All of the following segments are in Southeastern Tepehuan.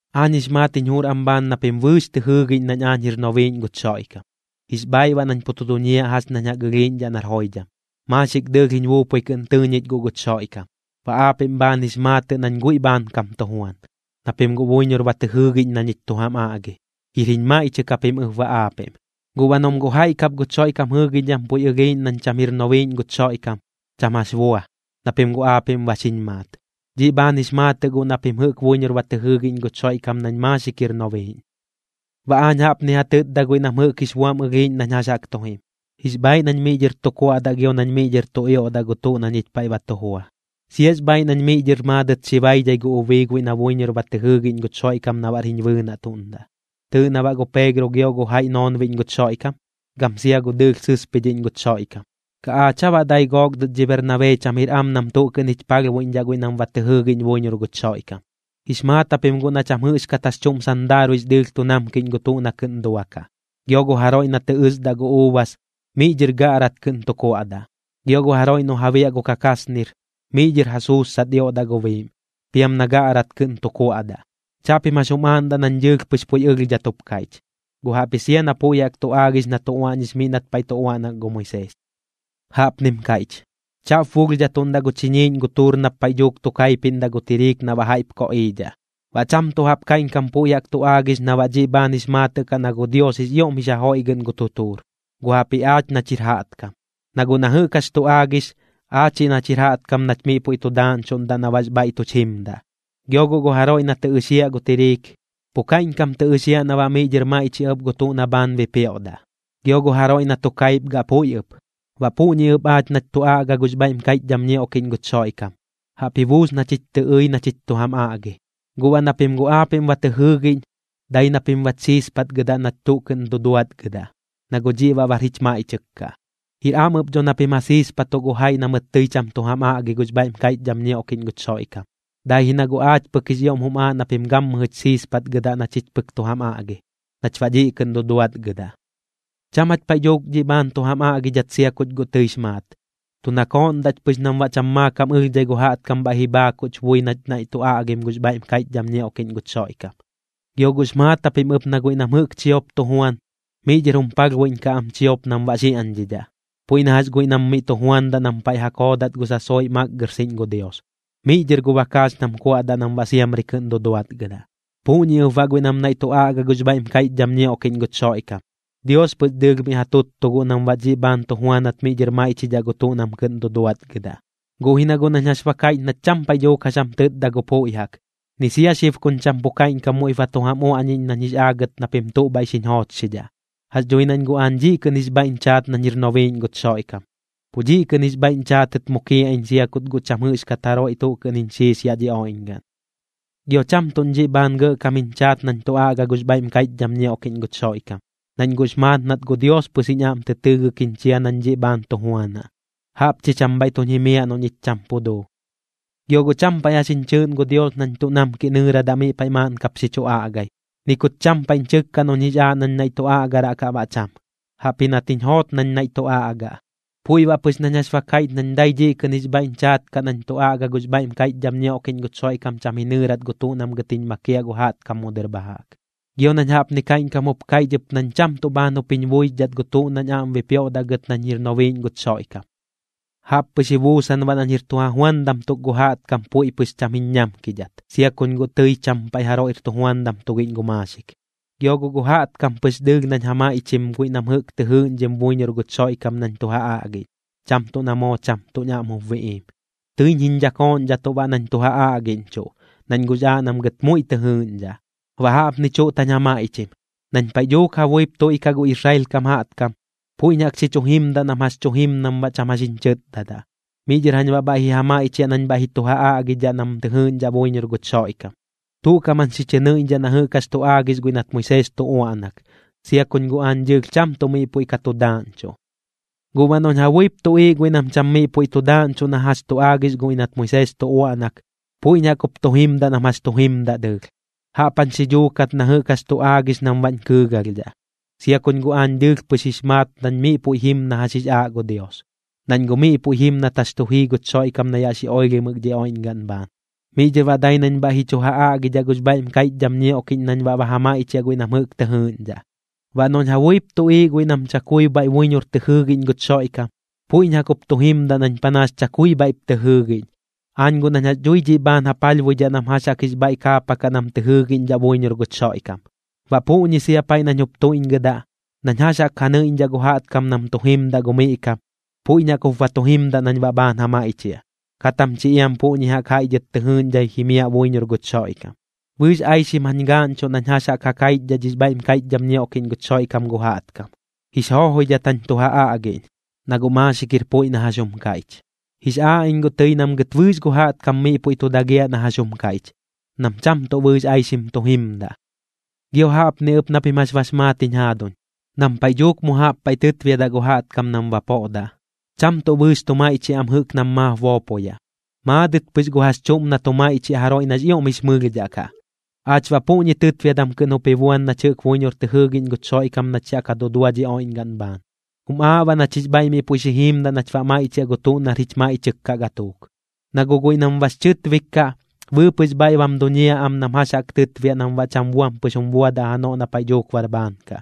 Aañ jix maat jiñ jur am bhaan na pim bɨɨx tɨ jɨɨgiꞌñ nañ aañ jir nobiiꞌñ guch Xoiꞌkam, jix bhaaiꞌ baꞌ nañ pu tu duñiaꞌ jax ñañ jaꞌk ɨlhiiꞌñdhaꞌ nar joidham, maaxik dɨɨlh jiñ buupui kɨꞌn tɨɨ ñich guꞌ guch Xoiꞌkam. Baꞌ aapiꞌm bhaan jix maatɨꞌ nañ guiꞌ bhaankam tu juan, na pim guꞌ buiñor ba tɨ jɨɨgiꞌñ na ñich tu jam aꞌgi. Jir jiñ maiꞌchɨk japim ɨp baꞌ aapiꞌm. Guꞌ baꞌ noꞌm guꞌ jaiꞌ kap guch Xoiꞌkam jɨɨgiꞌñdham puiꞌ ɨlhiiꞌñ nañ cham jir nobiiꞌñ guch Xoiꞌkam, cham jax bua, na pim guꞌ aapiꞌm ba xiñ maat. Dhiꞌ bhaan jix maatɨꞌ guꞌ na pim jɨꞌk buiñor ba tɨ jɨɨgiꞌñ guch Xoiꞌkam nañ maaxik jir nobiiꞌñ. Baꞌ aañ jaꞌpni ja tɨtda guiꞌ nam jɨꞌk jix buam ɨlhiiꞌñ nañ jax jaꞌk tu jim: Jix bhaaiꞌ nañ miꞌ dhɨr tu kuaꞌdaꞌ gio nañ miꞌ dhɨr tu ioꞌdaꞌ gu tuꞌ na ñich paiꞌ ba tu jua. Siax bhaaiꞌ nañ miꞌ dhɨr maadɨt xi baidhai gu ubii guiꞌ na buiñor ba tɨ jɨɨgiꞌñ guch Xoiꞌkam na baꞌr jiñ bɨɨnaꞌtuꞌndaꞌ. ¿Tɨɨꞌ na baꞌ gu Peegro gio gu jaiꞌ noonbiꞌñ guch Xoiꞌkam, gam sia gu dɨɨlh sɨspidhiꞌñ guch Xoiꞌkam? ¿Kaꞌ aach aa baꞌ dai gook dɨt dhi Bernabee cham jir am nam tuꞌ kɨꞌn jich palhbuiꞌñdhaꞌ guiꞌ nam ba tɨ jɨɨgiꞌñ buiñor guch Xoiꞌkam? Jix maat japim guꞌ na cham jɨꞌxkat jax chuꞌm sandaaruiꞌx dɨɨlh tu namkiꞌñ gu tuꞌ na kɨꞌn duakaꞌ. Gio gu jaroiꞌ na tɨ ɨsdaꞌ gu uubas, miꞌ dhɨr gaꞌrat kɨꞌn tu kuaꞌdaꞌ. Gio gu jaroiꞌ noꞌ ja biaꞌ gu kakaasnir, miꞌ dhɨr ja suussat ioꞌdaꞌ gu biiꞌm, piam na gaꞌrat kɨꞌn tu kuaꞌdaꞌ. Chaꞌpim jax jum aaꞌndaꞌ nañ dɨɨlh pɨx puiꞌ ɨlhdhat jup kaiꞌch, guꞌ jaꞌpji sia na puiꞌ jaꞌk tu aagix na tu uaꞌñix miꞌ nat paiꞌ tu uaꞌnak gu Moisees. Jaꞌpnim kaiꞌch: “Chaꞌp bulhdhatuꞌndaꞌ gu chiñiiꞌñ gu tuur nap paiꞌ dhuuk tu kaipiꞌndaꞌ gu tiriik na baꞌ jaiꞌp koꞌiidhaꞌ.” Baꞌ cham tuꞌ jaꞌp kaiꞌñkam puiꞌ jaꞌk tu aagix na baꞌ dhiꞌ bhaan jix maatɨꞌ kaꞌ na gu Dios jix ioꞌm jix ja joiꞌgɨꞌn gu tutuur, guꞌ jaꞌpji aach nach jir jaꞌtkam. Na guꞌ na jɨꞌk jax tu aagix, aachiꞌ nach jir jaꞌtkam nach miꞌ puiꞌ tu daaꞌñchuꞌndaꞌ na baꞌx bhaiꞌ tuch jimdaꞌ. Gio guꞌ gu jaroiꞌ na tɨ ɨxiaꞌ gu tiriik, pu kaiꞌñkam tɨ ɨxiaꞌ na baꞌ miꞌ dhɨr maiꞌchiaꞌ ɨp gu tuꞌ na bhaan bipioꞌdaꞌ, gio gu jaroiꞌ na tu kaipgaꞌ puiꞌ ɨp. Baꞌ puꞌñi ɨp aach nach tu aꞌga gux bhaiꞌm kaiꞌchdham ñioꞌkiꞌñ guch Xoiꞌkam, jaꞌp ji buus na chich tɨ ɨi na chich tu jam aꞌgi. Guꞌ baꞌ na pim guꞌ aapiꞌm ba tɨ jɨɨgiꞌñ, dai na pim bach siispatgɨdaꞌ nach tuꞌ kɨꞌn duduatgɨdaꞌ, na guꞌ dhiꞌ baꞌ bar jich maiꞌchɨk kaꞌ. Jir am ɨp dho noꞌ pim ja siispatuꞌ gu jaiꞌ na mɨt tɨi cham tu jam aꞌgi gux bhaiꞌm kaiꞌchdham ñioꞌkiꞌñ guch Xoiꞌkam, dai ji na guꞌ aach pɨk jix ioꞌm jum aaꞌ na pim gammɨjɨch siispatgɨdaꞌ na chich pɨk tu jam aꞌgi, nach baꞌ dhiꞌ kɨꞌn duduatgɨdaꞌ. Cham jach paiꞌ dhuuk dhiꞌ bhaan tu jam aꞌgidhat sia kuch guꞌ tɨix maat, tu nakooꞌndaꞌch pɨx nam baꞌ cham maakam ɨlhdhai gu jaꞌtkam bhaiꞌ ji bhaakuꞌch bui nach naiꞌ ka tu aꞌgim gux bhaiꞌm kaiꞌchdham ñioꞌkiꞌñ guch Xoiꞌkam. Gio guꞌx maat japim ɨp na guiꞌ nam jɨꞌk chiop tu juan, miꞌ dhɨr jum palhbuiꞌñkaꞌ am chiop nam baꞌ xiaꞌñdhidhaꞌ. Puiꞌ na jax guiꞌ nam miꞌ tu juandaꞌ nam paiꞌ ja koodat gu sasoiꞌ makgɨrxiꞌñ gu Dios, miꞌ dhɨr gu bakaax nam kuaꞌdaꞌ nam baꞌ siamri kɨꞌn duduatgɨdaꞌ. Puꞌñi ɨp baꞌ guiꞌ nam naiꞌ tu aꞌga gux bhaiꞌm kaiꞌchdham ñioꞌkiꞌñ guch Xoiꞌkam, Dios pɨx dɨɨlh miꞌ ja tuttuꞌ guꞌ nam baꞌ dhiꞌ bhaan tu juanat miꞌ dhɨr maiꞌchidhaꞌ gu tuꞌ nam kɨꞌn duduatgɨdaꞌ. Guꞌ ji na guꞌ nañ jax ba kaiꞌch nach cham paiꞌ dhuuk jax jam tɨtda gu puiꞌ jaꞌk, ni sia xib kuñ cham pu kaiꞌñkam muiꞌp ba tu jam uaꞌñiꞌñ nañ jix aagɨt na pim tuꞌ bhaiꞌ xiñ joochxidhaꞌ. Jax dhui nañ guꞌ aañ dhiꞌ kɨꞌn jix bhaiꞌñ chaat nañ jir nobiiꞌñ guch Xoiꞌkam, pu dhiꞌ kɨꞌn jix bhaiꞌñ chaatɨt mukiaꞌ iñ sia kut guꞌ cham jɨꞌxkat jaroiꞌ tuꞌ kɨꞌn jiñ xiis yaꞌ dhi oiꞌñgaꞌn. Gio cham tuꞌñ dhiꞌ bhaan gɇꞌkam jiñ chaat nañ tu aꞌga gux bhaiꞌm kaiꞌchdham ñioꞌkiꞌñ guch Xoiꞌkam, nañ guꞌx maat nat gu Dios pɨx jiñ aꞌm tɨ tɨɨgɨk jiñ chia nañ dhiꞌ bhaan tu juanaꞌ. Jaꞌp chi cham bhaiꞌ tuñ jimiaꞌ noꞌ ñich cham pu duu. Gio guꞌ cham paiꞌ jax jiñ chɨɨꞌn gu Dios nañ tuꞌ namkiꞌ nɨɨradaꞌ miꞌ paiꞌ maaꞌn kap xi chu aꞌgai, ni kut cham paiꞌñ chɨkka noꞌñ jix aaꞌ nañ naiꞌ tu aꞌgaraꞌ kaꞌ baꞌ cham. Jaꞌpji nat jiñ joot nañ naiꞌ tu aꞌgaꞌ. Puiꞌ baꞌ pɨx nañ jax ba kaiꞌch nañ dai dhiꞌ kɨꞌn jix bhaiꞌñ chaat kaꞌ nañ tu aꞌga gux bhaiꞌm kaiꞌchdham ñioꞌkiꞌñ guch Xoiꞌkam cham ji nɨɨrat gu tuꞌ nam gɨt jiñ makiaꞌ gu jaꞌtkam mu dɨr bha jaꞌk. Gio nañ jaꞌpni kaiꞌñkam jup kaiꞌch ɨp nañ cham tuꞌ bhaan jup jiñ buixdhat gu tuꞌ nañ aꞌm bipioꞌdaꞌ gɨt nañ jir nobiiꞌñ guch Xoiꞌkam. Jaꞌp pɨx ji buusan baꞌ nañ jir tu ja juandam tuk gu jaꞌtkam puiꞌ pɨx cham jiñ ñamkidhat, sia kuñ guꞌ tɨi cham paiꞌ jaroiꞌr tujuandam tugiꞌñ gu maaxik. Gio guꞌ gu jaꞌtkam pɨx dɨɨlh nañ ja maiꞌchim guiꞌ nam jɨꞌk tɨ jɨɨꞌñdhim buiñor guch Xoiꞌkam nañ tu ja aꞌgiꞌñ, cham tuꞌ na moo cham tuꞌñ aꞌm jup biꞌiim. Tɨiñ jiñ dhakooꞌñdhatuꞌ baꞌ nañ tu ja aꞌgiꞌñchuꞌ, nañ guꞌx aaꞌ nam gɨt muiꞌ tɨ jɨɨꞌñdhaꞌ. Baꞌ jaꞌpni chuꞌt jañ ja maiꞌchim: Nañ paiꞌ dhuuk ja buip tuiꞌkaꞌ gu Israel kam jaꞌtkam, puiꞌñ jaꞌk xi chu jimdaꞌ nam jax tu jim nam baꞌ cham jax jiñ chɨtdadaꞌ, miꞌ dhɨr jañ baꞌ bhaiꞌ ji ja maiꞌchiaꞌ nañ bhaiꞌ ji chu ja aꞌgidhaꞌ nam tɨ jɨɨꞌñdhaꞌ buiñor guch Xoiꞌkam. Tuꞌ kaꞌm jañ xi chɨ nɨiꞌñdhaꞌ na jɨꞌk jax tu aagix guiꞌ nat Moisees tu uaꞌnak, sia kuñ guꞌ aañ dɨɨlh cham tuꞌ miꞌ puiꞌ ka tu daaꞌñchuꞌ. Guꞌ baꞌ noꞌñ ja buip tuꞌiiꞌ guiꞌ nam cham miꞌ puiꞌ tu daaꞌñchuꞌ na jax tu aagix guiꞌ nat Moisees tu uaꞌnak, puiꞌñ jaꞌk jup tu jimdaꞌ nam jax tu jimdaꞌ dɨɨlh, jaꞌp jañ xi dhuukat na jɨꞌk jax tu aagix nam baꞌñ kɨɨgalhdhaꞌ, sia kuñ guꞌ aañ dɨɨlh pɨx jix maat nañ miꞌ puiꞌ jim na jax jix aaꞌ gu Dios, nañ guꞌ miꞌ puiꞌ jim nat jax tu jii guch Xoiꞌkam na yaꞌ xi oilhimɨk dhi oiꞌñgaꞌn bhaan. Miꞌ dhɨr baꞌ dai nañ bhaiꞌ ji chu ja aꞌgidhaꞌ gux bhaiꞌm kaiꞌchdham ñioꞌkiꞌñ nañ baꞌ ba ja maiꞌchiaꞌ guiꞌ nam jɨꞌk tɨ jɨɨꞌñdhaꞌ. Baꞌ noꞌñ ja buip tuꞌiiꞌ ɨp guiꞌ nam chakui bhaiꞌ buiñor tɨ jɨɨgiꞌñ guch Xoiꞌkam, puiꞌñ jaꞌk jup tu jimdaꞌ nañ panaas chakui bhaiꞌp tɨ jɨɨgiꞌñ, aañ guꞌ nañ jax dhui dhiꞌ bhaan ja palhbuidhaꞌ nam jax jaꞌk jix bhaiꞌ kaapakaꞌ nam tɨ jɨɨgiꞌñdhaꞌ buiñor guch Xoiꞌkam. Baꞌ puꞌñi sia paiꞌ nañ jup tuiꞌñgɨdaꞌ, nañ jax jaꞌk ja nɨiꞌñdhaꞌ gu jaꞌtkam nam tu jimdaꞌ gu miꞌ kam, puiꞌñ jaꞌk jup ba tu jimdaꞌ nañ baꞌ bhaan ja maiꞌchiaꞌ, kat jam chi iam puꞌñi jaꞌk jaiꞌ dhɨt tɨ jɨɨꞌñdhai jimiaꞌ buiñor guch Xoiꞌkam. Bɨɨx aixim jañ gaaꞌñchuꞌ nañ jax jaꞌk ja kaichdhaꞌ dhix bhaiꞌm kaiꞌchdham ñioꞌkiꞌñ guch Xoiꞌkam gu jaꞌtkam, jix joojoidhat jañ tu ja aꞌgiꞌñ, na guꞌ maaxik jir puiꞌ na jax jum kaiꞌch. Jix aaꞌ iñ guꞌ tɨi nam gɨt bɨɨx gu jaꞌtkam miꞌ puiꞌ tu dagiaꞌ na jax jum kaiꞌch, nam cham tuꞌ bɨɨx aixim tu jimdaꞌ. Gio jaꞌpni ɨp na pim jax bax maat jiñ jaaduñ, nam paiꞌ dhuuk mu jaꞌp paiꞌ tɨtbiadaꞌ gu jaꞌtkam nam bapoꞌdaꞌ, cham tuꞌ bɨɨx tu maiꞌchiaꞌ am jɨꞌk nam maap boopoyaꞌ, maadɨt pɨx gu jax chuꞌm na tu maiꞌchiaꞌ jaroiꞌ nax ioꞌm jix mɨlhdhaꞌ kaꞌ. Aach baꞌ puꞌñi tɨtbiadam kɨꞌn jup ji buan nach jɨꞌk buiñor tɨ jɨɨgiꞌñ guch Xoiꞌkam nach yaꞌ ka dudua dhi oiꞌñgaꞌn bhaan. Jum aaꞌ baꞌ nach jix bhaiꞌ miꞌ puiꞌ xi jiimdaꞌ nach baꞌ maiꞌchiaꞌ gu tuꞌ nar jich maiꞌchɨk kaꞌ gatuuk. Na guꞌ guiꞌ nam bax chɨtbik kaꞌ, bɨɨpɨꞌx bhaiꞌ bam duñiaꞌ am nam jax jaꞌk tɨtbiaꞌ nam baꞌ cham buam pɨx jum buadaꞌ janoꞌ na paiꞌ dhuuk bar bhaan kaꞌ.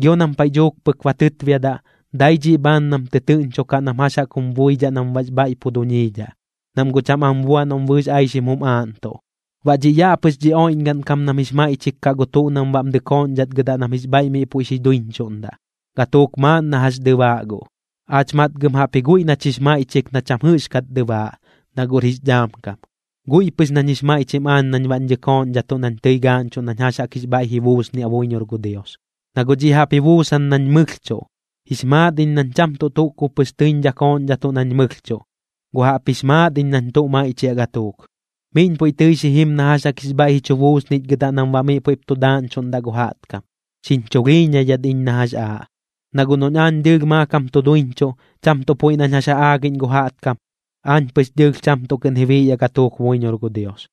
Gio nam paiꞌ dhuuk pɨk ba tɨtbiadaꞌ, dai dhiꞌ bhaan nam tɨtɨɨꞌñchokaꞌ nam jax jaꞌk jum buidhaꞌ nam baꞌx bhaiꞌ pu duñiidhaꞌ, nam guꞌ cham am buaꞌ noꞌm bɨɨx aixim jum aaꞌntuꞌ. Baꞌ dhiꞌ yaꞌ pɨx dhi oiꞌñgaꞌn kam nam jix maiꞌchik kaꞌ gu tuꞌ nam baꞌm dɨkooꞌñdhatgɨdaꞌ nam jix bhaiꞌ miꞌ puiꞌ xi duiñchuꞌndaꞌ, gatuuk maaꞌn na jax dɨbaaꞌ guꞌ. Aach matgɨm jaꞌpji guiꞌ nach jix maiꞌchik na cham jɨꞌxkat dɨbaaꞌ, na guꞌr jix dhaam kam. Guiꞌ pɨx nañ jix maiꞌchim aañ nañ baꞌñ dhakooꞌñdhatuꞌ nañ tɨi gaaꞌñchuꞌ nañ jax jaꞌk jix bhaiꞌ ji buusniaꞌ buiñor gu Dios, na guꞌ dhiꞌ jaꞌp ji buusan nañ mɨlhchuꞌ. Jix maat iñ nañ cham tuꞌ tuꞌ kub pɨx tɨiñ dhakooꞌñdhatuꞌ nañ mɨlhchuꞌ, guꞌ jaꞌpjix maat iñ nañ tu maiꞌchiaꞌ gatuuk. Miꞌñ puiꞌ tɨi xi jim na jax jaꞌk jix bhaiꞌ ji chu buusnichgɨdaꞌ nam baꞌ miꞌ puiꞌp tu daaꞌñchuꞌndaꞌ gu jaꞌtkam, xiñ chulhiiñaidhat iñ na jax aaꞌ. Na guꞌ noꞌñ aañ dɨɨlh maakam tu duiñchuꞌ, cham tuꞌ puiꞌ nañ jax ja aagiꞌñ gu jaꞌtkam, aañ pɨx dɨɨlh cham tuꞌ kɨꞌn ji biꞌyaꞌ gatuuk buiñor gu Dios.